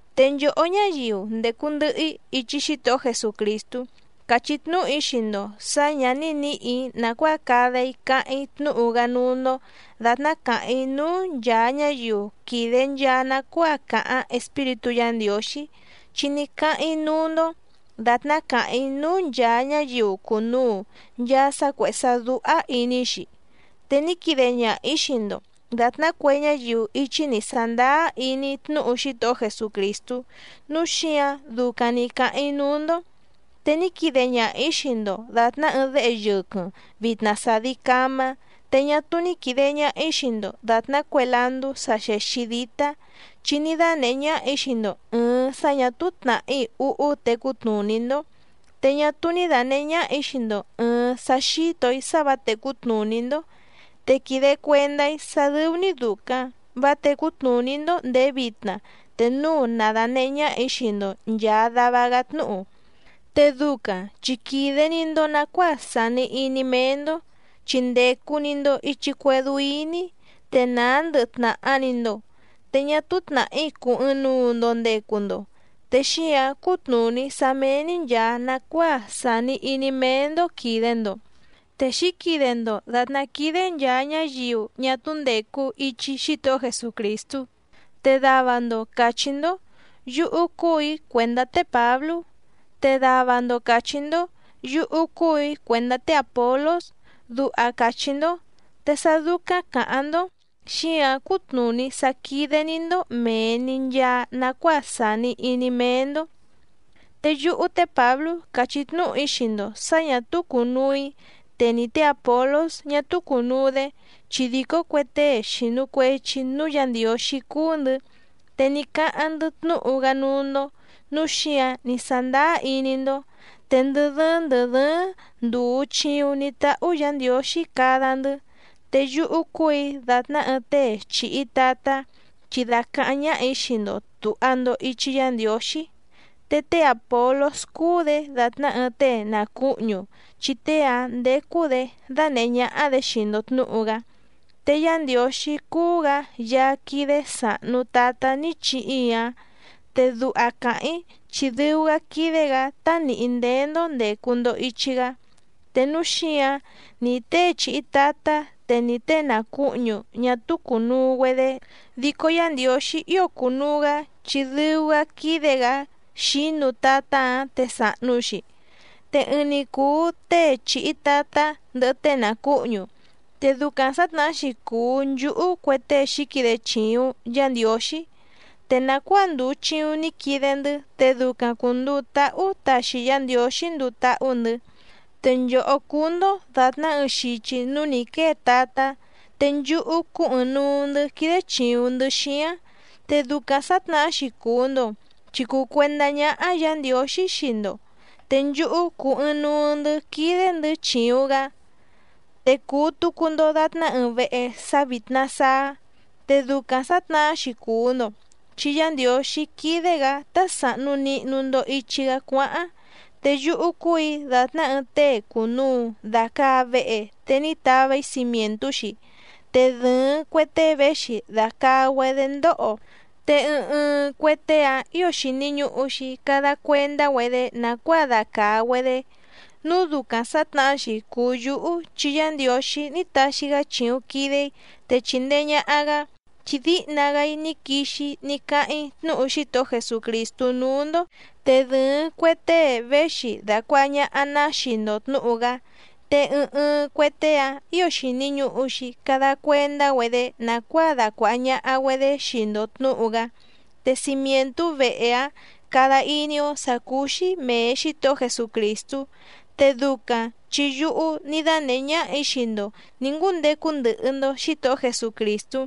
Te nchòhó ñáyiu ndècu ndɨhɨ‑í ichi Xítohó Jesucrìstú càchí tnúhu‑í xii‑ndo sǎ ñǎ ní nǐhì‑í nàcuáa cada‑í cáháⁿ‑í tnúhu‑gá núú‑ndó dàtná càháⁿ‑í núú nchàa ñáyiu quìde nchaa nacuáa càháⁿ Espíritú Yǎ Ndiǒxí, chi ní cáháⁿ‑í núú‑ndó dàtná càháⁿ‑í núú nchàa ñáyiu cùnuu nchaa sá cuèhé sá dúhá ìní‑xi, te ní quide ñaha‑ǐ xii‑ndo dàtná cue ñáyiu íchí nǐ sándáá iní tnúhu Xítohó Jesucrìstú, núu xíǎⁿ ducaⁿ nǐ cáháⁿ‑í núú‑ndó. Te ní quide ñaha‑ǐ xii‑ndo dàtná ɨɨⁿ déhe yɨquɨⁿ vìtna sadi camá, te ñá túú ní quìde ñaha‑í xii‑ndo dàtná cue landú sa xèxi dítá, chi ní dánèhé ñáhà‑í xii‑ndo ɨ̀ɨⁿ sá ñà túú tnàhí úhú tecú tnùní‑ndó, te ñá túú ní dànehé ñáhà‑í xii‑ndo ɨ̀ɨⁿ sá xítò‑í sá vǎ tècú tnùní‑ndó. Te quìde cuendá‑í sá dɨ́ú‑ní dùcaⁿ vá tècú tnùní‑ndó ndèé vitna te núu na dànehé ñáhà‑í xii‑ndo nchàa dava‑gá tnúhu. Te ducaⁿ chi quìde‑ni‑ndo nacuáa sàni iní méé‑ndó, chi ndècu‑ni‑ndo ichi cuédú íní, te nàá ndɨhɨ tnàha‑ni‑ndo, te ñá túú tnàhí cùu ɨɨⁿnuu‑ndo ndecu‑ndo. Te xíǎⁿ cútnùní sá méé‑ní nchàa nacuáa sàni iní méé‑ndó quìde‑ndo, te xǐquide‑ndo dàtná quídé nchàa ñáyiu ñá túú ndècu ichi Xítohó Jesucrìstú. Te dava‑ndo càchí‑ndó: “Yúhú cúù‑í cuèndá té Pǎblú.” Te dava‑ndo càchí‑ndó: “Yúhú cúù‑í cuèndá té Àpolós”, duha càchí‑ndó. Te sá dúcáⁿ càháⁿ‑ndó xíǎⁿ cútnùní sá quídé‑ní‑ndó mèe‑ni nchaa nacuáa sàni iní méé‑ndó. Te yúhú té Pǎblú càchí tnúhu‑í xii‑ndo sǎ ñà túú cùnuu‑í, te ni té Àpolós ñá túú cùnuu‑dé chi dìcó cue tée xìnu cuechi núú Yǎ Ndiǒxí cúú‑ndɨ̌, te ní cáháⁿ‑ndɨ́ tnúhu‑gá núú‑ndó, núu xíǎⁿ ní sándáá iní‑ndó. Te ndɨ dɨ́ɨ́ⁿ ndɨ̀ dɨ́ɨ́ⁿ ndùu chiuⁿ ní táhú Yǎ Ndiǒxí cada‑ndɨ́. Te yúhú cúù‑í dàtná ɨɨⁿ tée chìhi tatá chi dàcaháⁿ ñáhà‑í xii‑ndo tùha‑ndo ichi Yá Ndiǒxí. Te té Àpolós cúú‑dě dàtná ɨɨⁿ tée nàcuhñu chi tée‑áⁿ ndécú‑dě dánèhé ñáhá‑dě xii‑ndo tnǔhu‑gá. Te Yá Ndiǒxí cúú‑gǎ Yaá quídé sàhnu tatá ní chihi‑í‑áⁿ, te duha càháⁿ‑í chi dɨu‑gá quídé‑gǎ tá nìhí ndéé‑ndó ndècu‑ndo ichi‑gá. Te núu xíǎⁿ ni tée chìhi tatá te ní tée nàcuhñu ñá túú cùnuu‑güedé, dico Yá Ndiǒxí ío cùnuu‑gá chi dɨu‑gá quídé‑gǎ xǐnu tatá‑áⁿ te sàhnu‑xi. Te ɨɨⁿ‑ni cùu tée chìhi tatá ndɨhɨ tée nàcuhñu. Te ducaⁿ sǎtnahá‑xi cùu nchúhú cue tée xǐquide chìuⁿ Yá Ndiǒxí, te nàcuáa ndùu chiuⁿ ní quide‑ndɨ́ te ducaⁿ cùnduu táhú taxi Yá Ndiǒxí nduu táhú‑ndɨ̌. Te nchòhó cúú‑ndó dàtná ɨɨⁿ xichi núú nǐ quée tatá, te nchúhú cúú ɨ̀ɨⁿnuu‑ndɨ́ quídé chìuⁿ‑ndɨ́ xíáⁿ. Te ducaⁿ sǎtnahá‑xi cùu‑ndo chi cùu cuendá ñáhá Yǎ Ndiǒxí xii‑ndo, te nchúhú cúú ɨ̀ɨⁿnuu‑ndɨ́ quídé‑ndɨ̌ chìuⁿ‑gá. Te cùu tucu‑ndo datná ɨɨⁿ vehe sá vítná sáá, te ducaⁿ sǎtnahá‑xi cùu‑ndo chi Yá Ndiǒxí quídé‑gǎ tá sàhnu nihnu‑ndo ichi‑gá cuáháⁿ. Te yúhú cúù‑í dàtná ɨɨⁿ tée cùnuu dacaa vehe te ní tava‑í cimièntú‑xi, te dɨ̀ɨⁿ cue tée véxi dàcaa‑güedé ndóho, te ɨɨⁿ ɨɨⁿ cue tée‑áⁿ ǐo xìni ñuhu‑xi cada cuendá‑güedé nàcuáa dacàa‑güedé. Núu ducaⁿ sǎtnahá‑xi cùu yúhú chi Yá Ndiǒxí ní taxi‑gá chìuⁿ quide‑í te chìndee ñaha‑gá, chi díhna‑gá‑í ní quixi‑í ní cáháⁿ‑í tnúhu Xítohó Jesucrìstú núú‑ndó, te dɨ̀ɨⁿ cue tée véxi dàcuaha ñaha‑ná xii‑ndo tnǔhu‑gá, te ɨɨⁿ ɨɨⁿ cue tée‑áⁿ ǐo xìni ñuhu‑xi cada cuendá‑güedé nàcuáa dacuàha ñaha‑güedé xii‑ndo tnǔhu‑gá. Te cimièntú vehe‑áⁿ cada iní‑ó sǎ cúú‑xí mèe Xítohó Jesucrìstú, te ducaⁿ chi yúhú ní dánèhé ñáhà‑í xii‑ndo nǐ ngúndecu ndɨhɨ‑ndo Xǐtohó Jesucrìstú,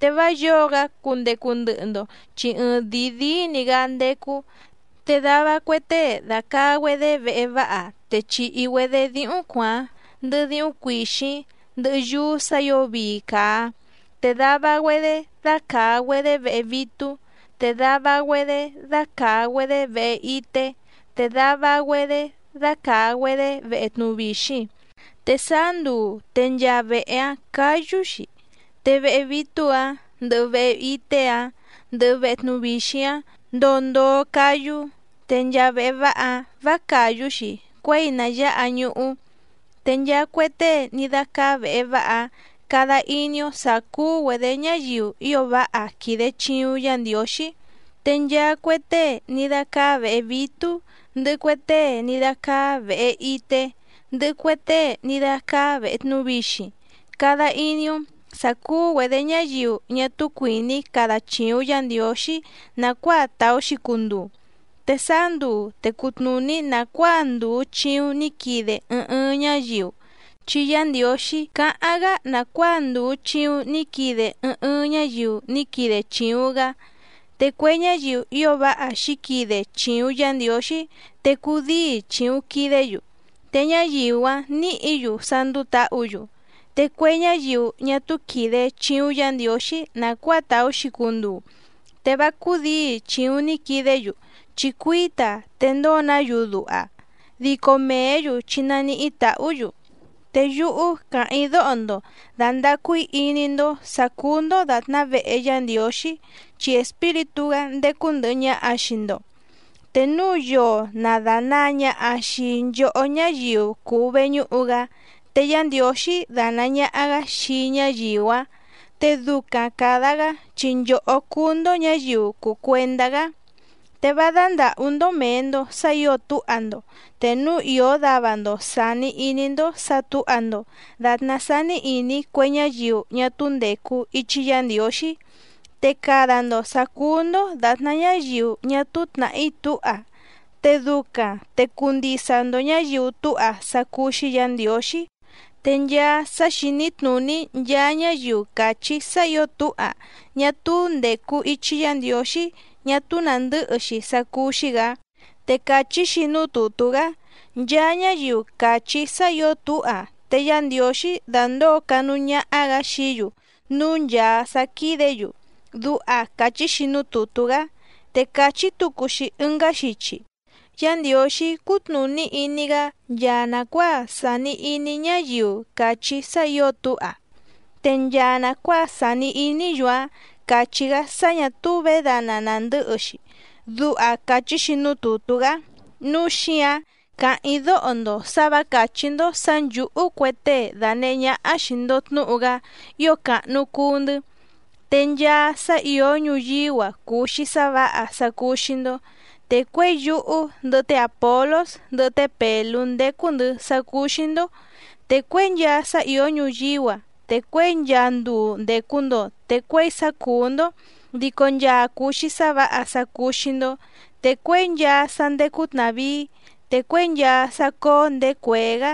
te vá yǒo‑gá cundecu ndɨhɨ‑ndo chi ɨɨⁿdìi díí‑ni‑gǎ ndécú. Te dava cue tée dàcaa‑güedé vehe váha te chìhi‑güedé díhúⁿ cuàáⁿ, ndɨhɨ díhúⁿ cuìxíⁿ, ndɨhɨ yúú sǎ ǐo vii càa. Te dava‑güedé dácàa‑güedé vehe vítú, te dava‑güedé dácàa‑güedé vehe ité, te dava‑güedé dácàa‑güedé vehe tnuvixiⁿ. Te sáá nduu te nchaa vehe‑áⁿ cǎyú‑xi, te vehe vítú‑ǎⁿ ndɨhɨ vehe ité‑áⁿ ndɨhɨ vehe tnuvixiⁿ‑áⁿ ndoo ndoo cáyú, te nchaa vehe váha‑áⁿ vǎ càyú‑xi cuěi na yǎha ñuhú. Te nchaa cue tée ní dácáá vèhe váha‑áⁿ cada iní‑ó sǎ cúú‑güedě ñáyiu ío váha quìde chiuⁿ Yá Ndiǒxí. Te nchaa cue tée ní dácáá vèhe vítú, ndɨhɨ cue tée ní dácáá vèhe ité, ndɨhɨ cue tée ní dácáá vèhe tnuvixiⁿ cada iní‑ó sǎ cúú‑güedě ñáyiu ñá túú cuìní cada chìuⁿ Yá Ndiǒxí nàcuáa tàú‑xi cunduu. Te sáá nduu te cutnùní nàcuáa ndùu chiuⁿ ní quide ɨɨⁿ ɨɨⁿ ñáyiu, chi Yá Ndiǒxí cáháⁿ‑gá nàcuáa ndùu chiuⁿ ní quide ɨɨⁿ ɨɨⁿ ñáyiu ní quide chìuⁿ‑gá. Te cue ñáyiu ío váha xǐquide chìuⁿ Yá Ndiǒxí te cùdíi chìuⁿ quidé‑yu, te ñáyiu‑áⁿ nǐhǐ‑yu sá ndúú tǎhǔ‑yu. Te cue ñáyiu ñá túú quìde chiuⁿ Yá Ndiǒxí nàcuáa tàú‑xi cunduu, te vá cúdǐi chìuⁿ ní quidé‑yu chi cuíta te ndóo‑ná‑yu duha, dico mèé‑yu chi naníhí tàhú‑yu. Te yúhú càháⁿ‑í dóho‑ndo dàndacu‑í iní‑ndó sǎ cúú‑ndó dàtná vehe Yá Ndiǒxí, chi Espíritú‑gá ndécú ndɨ̀hɨ ñaha‑xi xii‑ndo. Te núu yoo na dànaa ñaha xii nchohó ñáyiu cùu veñúhu‑gá, te Yá Ndiǒxí danàa ñaha‑gá xii ñáyiu‑áⁿ, te ducaⁿ càda‑gá chi nchòhó cúú‑ndó ñǎyiu cùu cuendá‑gá. Te vá dándàhú‑ndó mèe‑ndo sá ǐo túha‑ndo. Te núu ìó dava‑ndo sàni iní‑ndó sǎ tǔha‑ndo dàtná sání ìní cue ñáyiu ñá túú ndècu ichi Yá Ndiǒxí, te cada‑ndo sǎ cúú‑ndó dàtná ñáyiu ñá túú tnàhí túha, te ducaⁿ te cuu ndisa‑ndo ñǎyiu túha sá cúú‑xí Yǎ Ndiǒxí. Te nchaa sá xìní tnùní nchaa ñáyiu càchí sá ǐo túha ñá túú ndècu ichi Yá Ndiǒxí ñá túú nàndɨ́hɨ‑xi sá cúú‑xí‑gǎ. Te càchí‑xi núú tùtú‑gá: “Nchaa ñáyiu càchí sá ǐo túha te Yá Ndiǒxí dandǒo canúú ñáhá‑gǎ xií‑yu núú nchàa sá quídě‑yu”, duha càchí‑xi núú tùtú‑gá. Te càchí tucu‑xi ɨngá xichi: “Yá Ndiǒxí cútnùní iní‑gá nchaa nàcuáa sàni iní ñáyiu càchí sá ǐo túha. Te nchaa nàcuáa sàni iní‑yu‑áⁿ càchí‑gá sá ñà túú vědana nàndɨ́hɨ‑xi”, duha càchí‑xi núú tùtú‑gá. Núu xíǎⁿ càháⁿ‑í dóho‑ndo sǎ vǎ càchí‑ndó sǎ nchǔhú cue tée dànehé ñáhá xìi‑ndo tnúhu‑gá ío càhnu cuu‑ndɨ́. Te nchaa sá ìó ñuyíú‑a cùu‑xi sá vǎha sá cúú‑xí‑ndó. Te cuěi yúhú ndɨhɨ té Àpolós ndɨhɨ té Pèlú ndécú‑ndɨ̌ sá cúú‑xí‑ndó, te cuěi nchaa sá ìó ñuyíú‑a te cuěi nchaa nduu ndècu‑ndo te cuěi sá cùú‑ndó dico nchaa cùu‑xi sá vǎha sá cúú‑xí‑ndó. Te cuěi nchaa sá ndécú tnàvíí, te cuěi nchaa sá cóó ndèé cuèé‑gá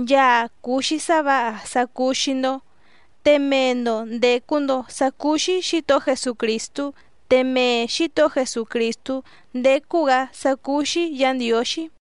nchaa cùu‑xi sá vǎha sá cúú‑xí‑ndó. Te mee‑ndo ndècu‑ndo sá cúú‑xí Xǐtohó Jesucrìstú, te mee Xǐtohó Jesucrìstú ndécú‑gǎ sá cúú‑xí Yǎ Ndiǒxí.